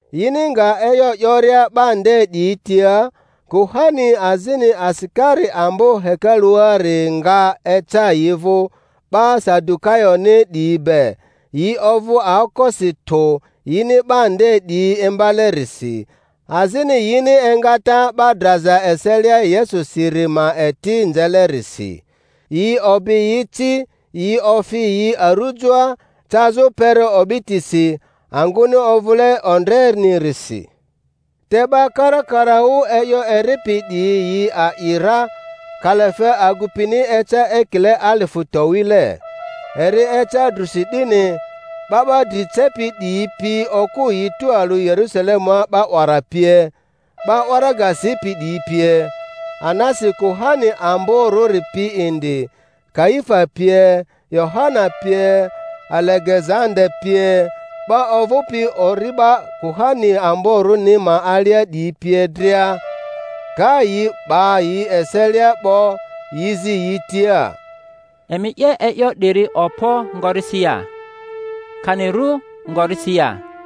Yini nga e'yo 'yoria 'ba nde 'diyi tia, kuhani azini asikari ambo hekaluari nga eca yi vᴜ 'ba Sadukayoni 'diyi be; yi ovᴜ aokosi tᴜ yini 'ba nde 'diyi imbale-risi, azini yini engata 'ba draza eselia Yesusiri ma eti nzelerisi. Yi obi yi ci, yi ofi yi arujoa cazᴜ kpere o'bitisi, angᴜni ovᴜle ondre-nirisi. Te 'ba karakaraᴜ e'yo eripi 'diyi yi a'i ra; kalafe agupini eca ekile alifᴜ towile. Eri eca drᴜsi 'dini, 'ba 'ba dri cepi 'diyi pi okᴜ yi tualᴜ Yerusalemua 'ba 'wara pie, 'ba waraga sipi 'diyi pie; Anasi kuhani amborᴜri pi indi, Kaifa pie, Yohana pie, Alegezanda pie, 'ba ovᴜpi ori'ba kuhani amborᴜni ma alia 'diyi pie dria. Ka yi 'ba yi eselia 'bo. yi zi yi tia, Emi 'ye e'yo 'diri okpo ngorisi ya, kani ru ngorisi ya?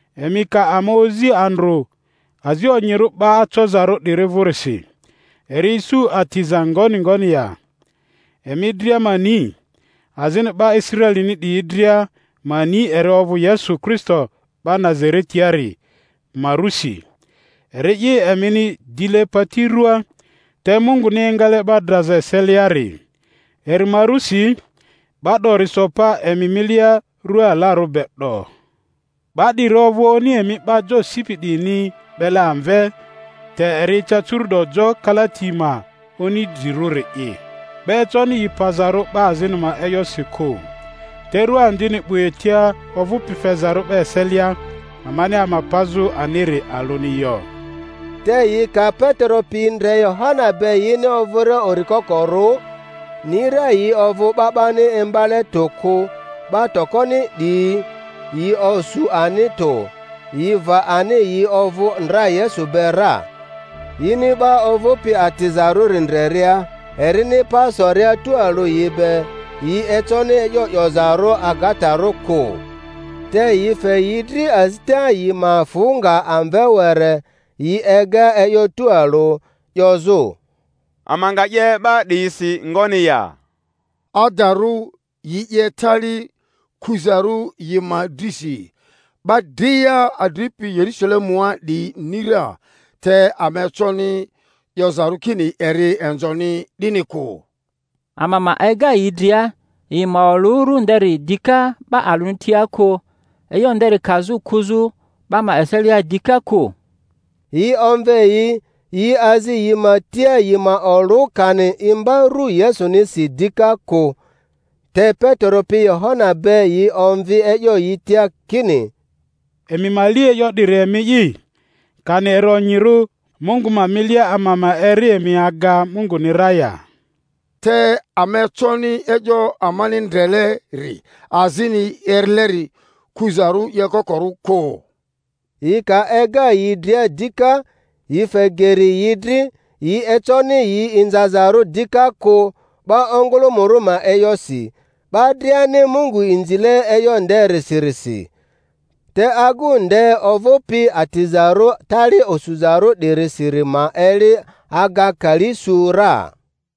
emi ka ama ozi andrᴜ azi onyirᴜ 'ba acozarᴜ 'diri vᴜrisi, eri isu atiza ngoni ngoni ya, emi dria ma ni, azini 'ba Israelini 'diyi dria ma ni eri ovᴜ Yesu Kristo 'ba Nazaretiari ma rᴜsi, eri'i emini dile pati ruaa te Munguni engale 'ba draza eseliari; eri ma rusi 'ba 'dori so pa emi milia rua alarᴜ be 'do. 'Ba 'diri ovᴜ oni emi 'ba jo sipi 'diyini 'bele amve te eri eca curu'do jo kalati ma oni drirᴜri'i 'Ba econi yi pazarᴜ 'ba azini ma e'yosi kᴜ, te ru andini 'bu etia ovᴜpi fezarᴜ 'ba eselia, amani ama pazᴜ aniri alᴜni yo. Te yi ka Petero pi ndre Yohana be yini ovᴜria uri kokoru, ni ra yi ovᴜ 'ba 'bani imbale tᴜ kᴜ, 'ba tokoni 'diyi, yi osu ani tᴜ; yi va ani yi ovᴜ ndra Yesu be ra. Yini 'ba ovᴜpi atizarᴜri ndreria erini pa soria tualᴜ yi be, yi econi e'yo 'yozarᴜ agatarᴜ kᴜ. Te yi fe yi dri azita yi ma fᴜ nga amve were, yi ega e'yo tualᴜ, 'yozᴜ, Ama nga 'ye 'ba 'diyisi ngoni ya? Adarᴜ yi 'ye tali kuzarᴜ yi ma drisi; 'ba dria adripi Yerusalemua 'diyi ni ra, te ama econi 'yozarᴜ kini eri inzoni, 'dini kᴜ. Ama ma ega yi dria, yi ma olᴜ ru nderi dika 'ba alᴜni tia kᴜ, e'yo nderi kazᴜ kuzᴜ 'ba ma eselia dika kᴜ. Yi omve yi, yi azi yi ma tia yi ma olᴜ kani imba ru Yesunisi dika kᴜ. Te Petero pi Yohana be yi omvi e'yo yi tia kini, Emi ma li e'yo 'diri emi'i, kani eri onyirᴜ Mungu ma milia ama ma eri emi aga Munguni ra ya; te ama econi e'yo amani ndreleri azini erileri kᴜzarᴜ 'yokokorᴜ kᴜ. Yi ka ega yi dria dika, yi fe geri yi dri, yi econi yi inzazarᴜ dika kᴜ 'ba ongᴜlᴜmᴜrᴜ ma e'yosi; 'ba driani Mungu inzile e'yo nderisirisi. Te agu nde ovᴜpi atizarᴜ tali osuzarᴜ 'dirisiri ma eli aga kali su ra.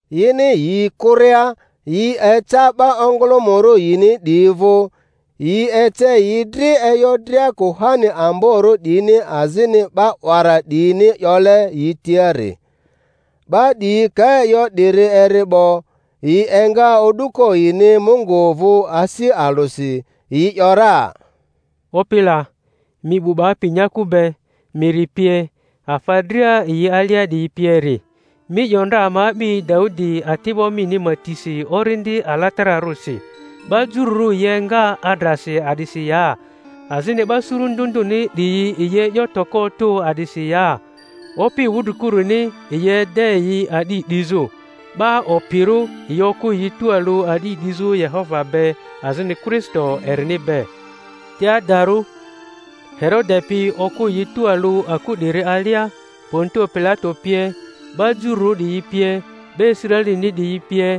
Yini yi kᴜria, yi eca 'ba ongᴜlᴜmᴜrᴜ yini 'diyi vᴜ, yi ece yi dri e'yo dria kuhani amborᴜ 'diyini azini 'ba 'wara 'diyini 'yole yi tiari. 'Ba 'diyi ka e'yo 'diri eri 'bo, yi enga o'duko yini Mungu vᴜ asi alᴜsi, yi ‘yora, Opi la, mi 'bu 'bapi nyaku be, miri pie, afa dria yi alia 'diyi pieri, mi 'yo ndra ama a'bi Daudi ati'bo mini ma tisi Orindi Alatararᴜsi, 'Ba jururᴜ yi enga adrasi a'disi ya? Azini 'ba suru ndᴜ ndᴜni 'diyi yi e'yo toko otᴜ a'disi ya? Opi wudrikurᴜni yi ede yi a'di 'dizᴜ, 'ba opirᴜ yi okᴜ yi tualᴜ a'di 'dizᴜ Yehova be azini Kristo erini be— te adarᴜ Herode pi okᴜ yi tualᴜ aku 'diri alia, Pontio Pilato pie, 'ba Jururᴜ 'diyi pie, 'ba Israelini 'diyi pie,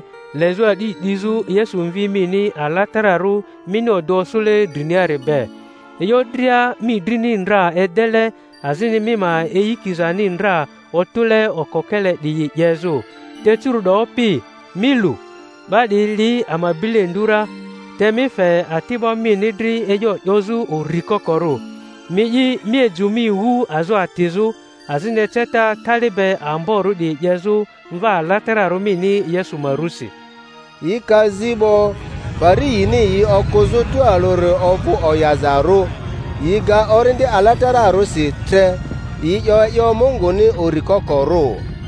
lezᴜ a'di 'dizᴜ Yesu Mvi mini alatararᴜ mini odᴜ osᴜle driniari be, e'yo dria mi drini ndra edele azini mi ma eyikizani ndra otᴜle okokele 'diyi 'yezᴜ. Te curu'do, Opi, mi lu, 'ba 'diyi li ama bilendu ra, te mi fe ati'ba mini dri e'yo 'yozᴜ uri kokorᴜ. Mi'i mi ejᴜ mi wu azo atizᴜ, azini eceta tali be amborᴜ 'diyi 'yezᴜ Mva alatararᴜ mini Yesu ma rusi. Yi ka zi 'bo, pari yini yi okᴜzᴜ tualᴜri ovᴜ oyazarᴜ; yi ga Orindi Alatararᴜsi tre, yi 'yo e'yo Munguni uri kokorᴜ.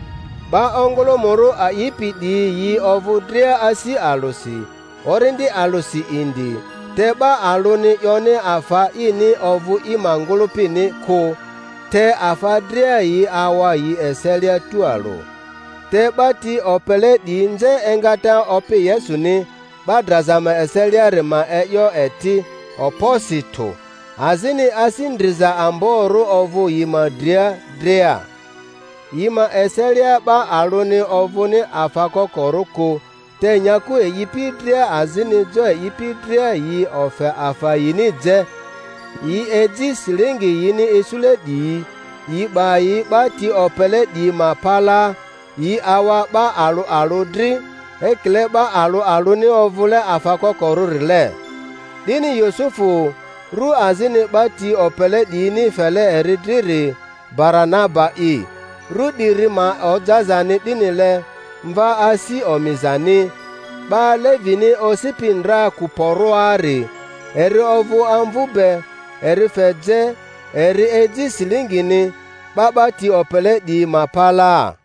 'Ba ongᴜlᴜmᴜrᴜ a'ipi 'diyi yi ovᴜ dria asi alᴜsi, orindi alᴜsi indi, te 'ba alᴜni 'yoni afa ini ovᴜ i ma ngᴜlᴜpini kᴜ, te afa dria yi awa yi eselia tualᴜ. Te 'ba ti opele 'diyi nze engata Opi Yesuni 'ba draza ma eseliari ma e'yo eti okposi tᴜ, azini asi ndriza amborᴜ ovᴜ yi ma dria dria. Yi ma eselia 'ba alᴜni ovᴜni afa kokorᴜ kᴜ, te nyaku e'ipi dria azini jo e'ipi dria yi ofe afa yini je, yi eji silingi yini isule 'diyi, yi 'ba yi 'ba ti opele 'diyi ma palaa; yi awa 'ba alᴜ alᴜ dri ekile 'ba alᴜ alᴜni ovᴜle afa kokorᴜrile. 'Dini Yusufu, ru azini 'ba ti opele 'diyini fele eri driri Baranaba'i (ru 'diri ma ojazani 'dinile, Mva asi omizani), 'ba Levini osipi ndra Kuporoari, eri ovᴜ amvu be, eri fe je, eri eji silingini, 'ba 'ba ti opele 'diyi ma palaa.